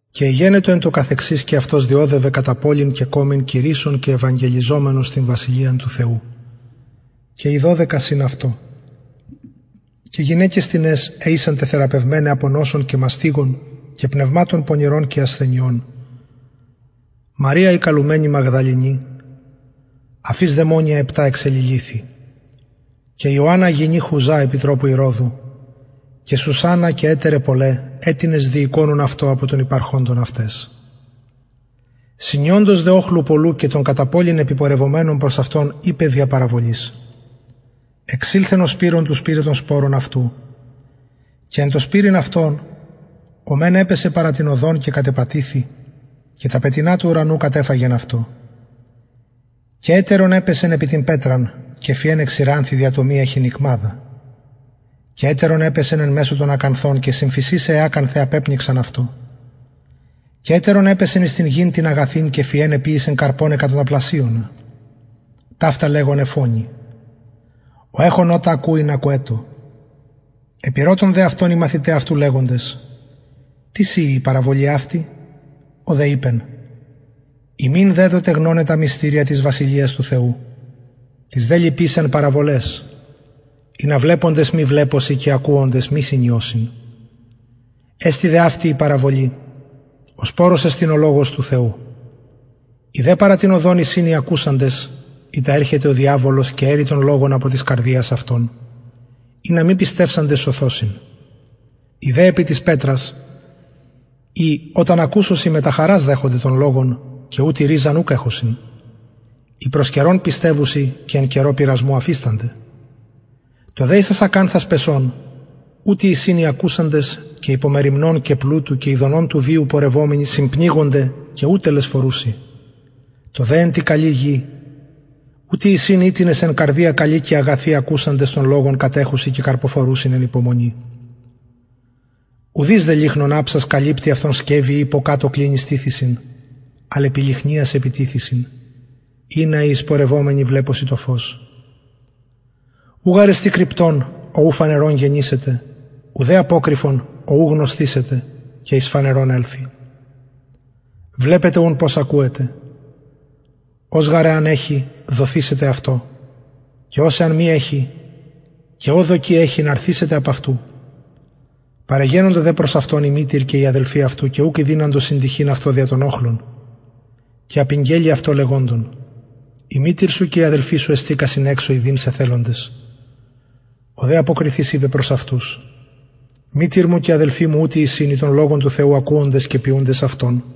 και εγενετο εν τω καθεξης και αυτος διωδευεν κατα πολιν και κωμην κηρυσσων και ευαγγελιζομενος την βασιλειαν του θεου και οι δωδεκα συν αυτω και γυναικες τινες αι ησαν τεθεραπευμεναι απο πνευματων πονηρων και ασθενειων μαρια η καλουμενη μαγδαληνη αφ ης δαιμονια επτα εξεληλυθει και ιωαννα γυνη χουζα επιτροπου ηρωδου και σουσαννα και ετεραι πολλαι αιτινες διηκονουν αυτοις απο των υπαρχοντων αυταις συνιοντος δε οχλου πολλου και των κατα πολιν επιπορευομενων προς αυτον ειπεν δια παραβολης εξηλθεν ο σπειρων του σπειραι τον σπορον αυτου και εν τω σπειρειν αυτον ο μεν επεσεν παρα την οδον και κατεπατηθη και τα πετεινα του ουρανου κατεφαγεν αυτο και ετερον επεσεν επι την πετραν και φυεν εξηρανθη δια το μη εχειν ικμαδα και ετερον επεσεν εν μεσω των ακανθων και συμφυεισαι αι ακανθαι απεπνιξαν αυτο και ετερον επεσεν εις την γην την αγαθην και φυεν εποιησεν καρπον εκατονταπλασιονα ταυτα λεγων εφωνει ο εχων ωτα ακουειν ακουετω επηρωτων δε αυτον οι μαθηται αυτου λεγοντες τις ειη η παραβολη αυτη ο δε ειπεν υμιν δεδοται γνωναι τα μυστηρια της βασιλειας του θεου τοις δε λοιποις εν παραβολαις ινα βλεποντες μη βλεπωσιν και ακουοντες μη συνιωσιν εστιν δε αυτη η παραβολη ο σπορος εστιν ο λογος του θεου οι δε παρα την οδον εισιν οι ακουοντες ειτα ερχεται ο διαβολος και αιρει τον λογον απο της καρδιας αυτων ινα μη πιστευσαντες σωθωσιν οι δε επι της πετρας οι οταν ακουσωσιν μετα χαρας δεχονται τον λογον και ουτοι ριζαν ουκ εχουσιν οι προς καιρον πιστευουσιν και εν καιρω πειρασμου αφιστανται το δε εις τας ακανθας πεσον ουτοι εισιν οι ακουσαντες και υπο μεριμνων και πλουτου και ηδονων του βιου πορευομενοι συμπνιγονται και ου τελεσφορουσιν το δε εν τη καλη γη ουτοι εισιν οιτινες εν καρδια καλη και αγαθη ακουσαντες τον λογον κατεχουσιν και καρποφορουσιν εν υπομονη ουδεις δε λυχνον αψας καλυπτει αυτον σκευει η υποκατω κλινης τιθησιν αλλ επι λυχνιας επιτιθησιν ινα οι εισπορευομενοι βλεπωσιν το φως ου γαρ εστιν κρυπτον ο ου φανερον γενησεται ουδε αποκρυφον ο ου γνωσθησεται και εις φανερον ελθη βλεπετε ουν πως ακουετε ος γαρ εαν εχη δοθησεται αυτω και ος εαν μη εχη και ο δοκει εχειν αρθησεται απ αυτου παρεγενοντο δε προς αυτον η μητηρ και οι αδελφοι αυτου και ουκ ηδυναντο συντυχειν αυτω δια τον οχλον και απηγγελη αυτω λεγοντων η μητηρ σου και οι αδελφοι σου εστηκασιν εξω ιδειν σε θελοντες ο δε αποκριθεις ειπεν προς αυτους μητηρ μου και αδελφοι μου ουτοι εισιν οι τον λογον του θεου ακουοντες και ποιουντες αυτον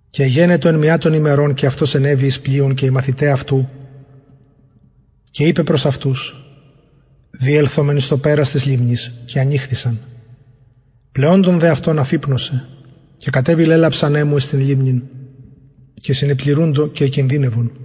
και εγενετο εν μια των ημερων και αυτος ενεβη εις πλοιον και οι μαθηται αυτου και ειπεν προς αυτους διελθωμεν εις το περαν της λιμνης και ανηχθησαν πλεοντων δε αυτων αφυπνωσεν και κατεβη λαιλαψ ανεμου εις την λιμνην και συνεπληρουντο και εκινδυνευον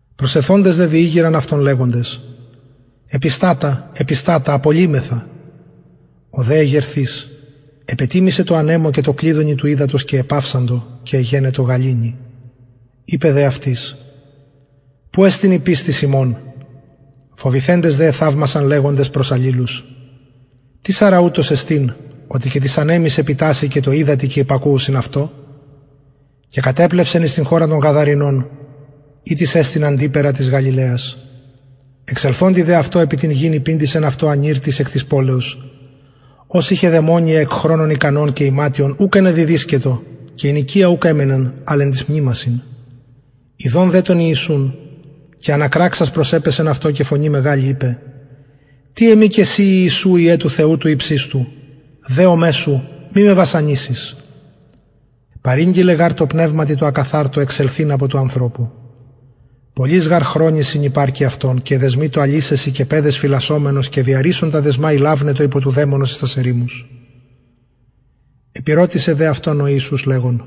προσελθοντες δε διηγειραν αυτον λεγοντες επιστατα επιστατα απολλυμεθα ο δε εγερθεις επετιμησεν τω ανεμω και τω κλυδωνι του υδατος και επαυσαντο και εγενετο γαληνη ειπεν δε αυτοις που εστιν η πιστις υμων φοβηθεντες δε εθαυμασαν λεγοντες προς αλληλους τις αρα ουτος εστιν οτι και τοις ανεμοις επιτασσει και τω υδατι και υπακουουσιν αυτω και κατεπλευσαν εις την χωραν των γαδαρηνων ητις εστιν αντιπεραν της γαλιλαιας εξελθοντι δε αυτω επι την γην υπηντησεν αυτω ανηρ τις εκ της πολεως ος ειχεν δαιμονια εκ χρονων ικανων και ιματιον ουκ ενεδιδυσκετο και εν οικια ουκ εμενεν αλλ εν τοις μνημασιν ιδων δε τον ιησουν και ανακραξας προσεπεσεν αυτω και φωνη μεγαλη ειπεν τι εμοι και σοι ιησου υιε του θεου του υψιστου δεομαι σου μη με βασανισης παρηγγειλεν γαρ τω πνευματι τω ακαθαρτω εξελθειν απο του ανθρωπου πολλοις γαρ χρονοις συνηρπακει αυτον και εδεσμειτο αλυσεσιν και πεδαις φυλασσομενος και διαρρησσων τα δεσμα ηλαυνετο υπο του δαιμονος εις τας ερημους επηρωτησεν δε αυτον ο ιησους λεγων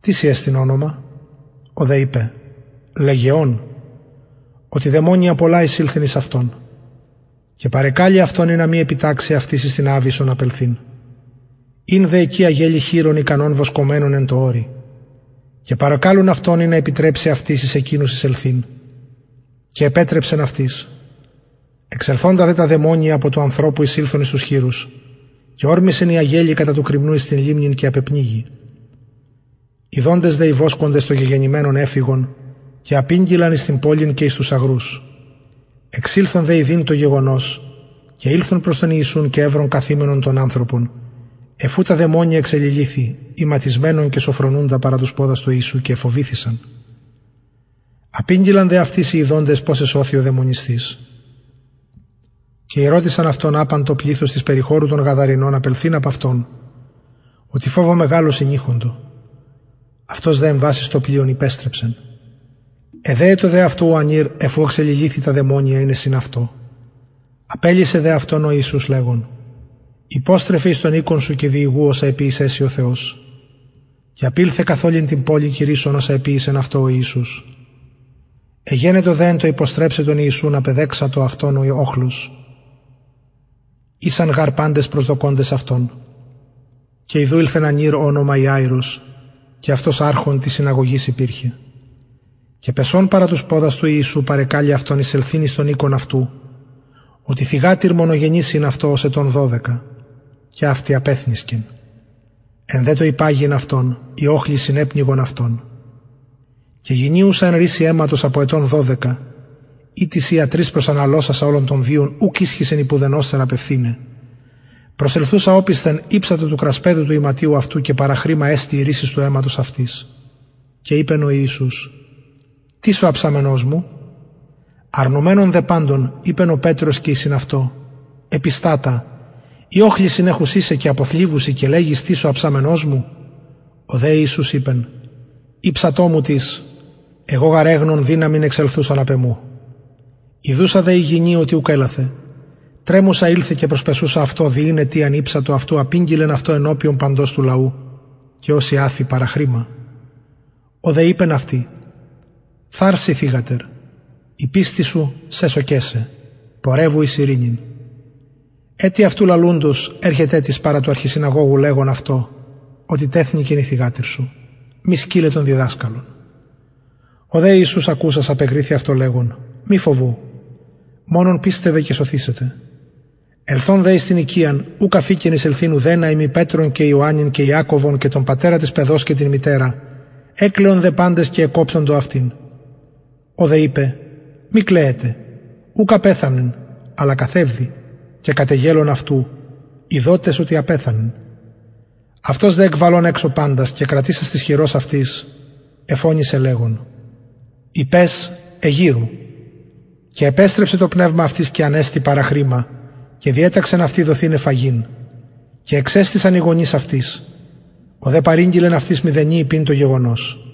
τι σοι εστιν ονομα ο δε ειπεν λεγεων οτι δαιμονια πολλα εισηλθεν εις αυτον και παρεκαλει αυτον ινα μη επιταξη αυτοις εις την αβυσσον απελθειν ην δε εκει αγελη χοιρων ικανων βοσκομενων εν τω ορει και παρεκαλουν αυτον ινα επιτρεψη αυτοις εις εκεινους εισελθειν και επετρεψεν αυτοις εξελθοντα δε τα δαιμονια απο του ανθρωπου εισηλθον εις τους χοιρους και ωρμησεν η αγελη κατα του κρημνου εις την λιμνην και απεπνιγη ιδοντες δε οι βοσκοντες το γεγενημενον εφυγον και απηγγειλαν εις την πολιν και εις τους αγρους εξηλθον δε ιδειν το γεγονος και ηλθον προς τον ιησουν και ευρον καθημενον τον ανθρωπον αφ ου τα δαιμονια εξεληλυθει ιματισμενον και σωφρονουντα παρα τους ποδας του ιησου και εφοβηθησαν απηγγειλαν δε αυτοις και οι ιδοντες πως εσωθη ο δαιμονισθεις και ηρωτησαν αυτον απαν το πληθος της περιχωρου των γαδαρηνων απελθειν απ αυτων οτι φοβω μεγαλω συνειχοντο αυτος δε εμβας εις το πλοιον υπεστρεψεν εδεετο δε αυτου ο ανηρ αφ ου εξεληλυθει τα δαιμονια ειναι συν αυτω απελυσεν δε αυτον ο ιησους λεγων υποστρεφε εις τον οικον σου και διηγου οσα εποιησεν σοι ο θεος και απηλθεν καθ ολην την πολιν κηρυσσων οσα εποιησεν αυτω ο ιησους εγενετο δε εν τω υποστρεψαι τον ιησουν απεδεξατο αυτον ο οχλος ησαν γαρ παντες προσδοκωντες αυτον και ιδου ηλθεν ανηρ ω ονομα ιαειρος και αυτος αρχων της συναγωγης υπηρχεν και πεσων παρα τους ποδας του ιησου παρεκαλει αυτον εισελθειν εις τον οικον αυτου οτι θυγατηρ μονογενης ην αυτω ως ετων δωδεκα και αυτη απεθνησκεν εν δε τω υπαγειν αυτον οι οχλοι συνεπνιγον αυτον και γυνη ουσα εν ρυσει αιματος απο ετων δωδεκα ητις ιατροις προσαναλωσασα ολον τον βιον ουκ ισχυσεν υπ ουδενος θεραπευθηναι προσελθουσα οπισθεν ηψατο του κρασπεδου του ιματιου αυτου και παραχρημα εστη η ρυσις του αιματος αυτης και ειπεν ο ιησους τις ο αψαμενος μου αρνουμενων δε παντων ειπεν ο πετρος και οι μετ αυτου επιστατα οι οχλοι συνεχουσιν σε και αποθλιβουσιν και λεγεις τις ο αψαμενος μου ο δε ιησους ειπεν ηψατο μου τις εγω γαρ εγνων δυναμιν εξελθουσαν απ εμου ιδουσα δε η γυνη οτι ουκ ελαθεν τρεμουσα ηλθεν και προσπεσουσα αυτω δι ην αιτιαν ηψατο αυτου απηγγειλεν αυτω ενωπιον παντος του λαου και ως ιαθη παραχρημα ο δε ειπεν αυτη θαρσει θυγατερ η πιστις σου σεσωκεν σε πορευου εις ειρηνην ετι αυτου λαλουντος ερχεται τις παρα του αρχισυναγωγου λεγων αυτω οτι τεθνηκεν η θυγατηρ σου μη σκυλλε τον διδασκαλον ο δε ιησους ακουσας απεκριθη αυτω λεγων μη φοβου μονον πιστευε και σωθησεται ελθων δε εις την οικιαν ουκ αφηκεν εισελθειν ουδενα ει μη πετρον και ιωαννην και ιακωβον και τον πατερα της παιδος και την μητερα εκλαιον δε παντες και εκοπτοντο αυτην ο δε ειπεν μη κλαιετε ουκ απεθανεν αλλα καθευδει και κατεγελων αυτου ειδοτες οτι απεθανεν αυτος δε εκβαλων εξω παντας και κρατησας της χειρος αυτης εφωνησεν λεγων η παις εγειρου και επεστρεψεν το πνευμα αυτης και ανεστη παραχρημα και διεταξεν αυτη δοθηναι φαγειν και εξεστησαν οι γονεις αυτης ο δε παρηγγειλεν αυτοις μηδενι ειπειν το γεγονος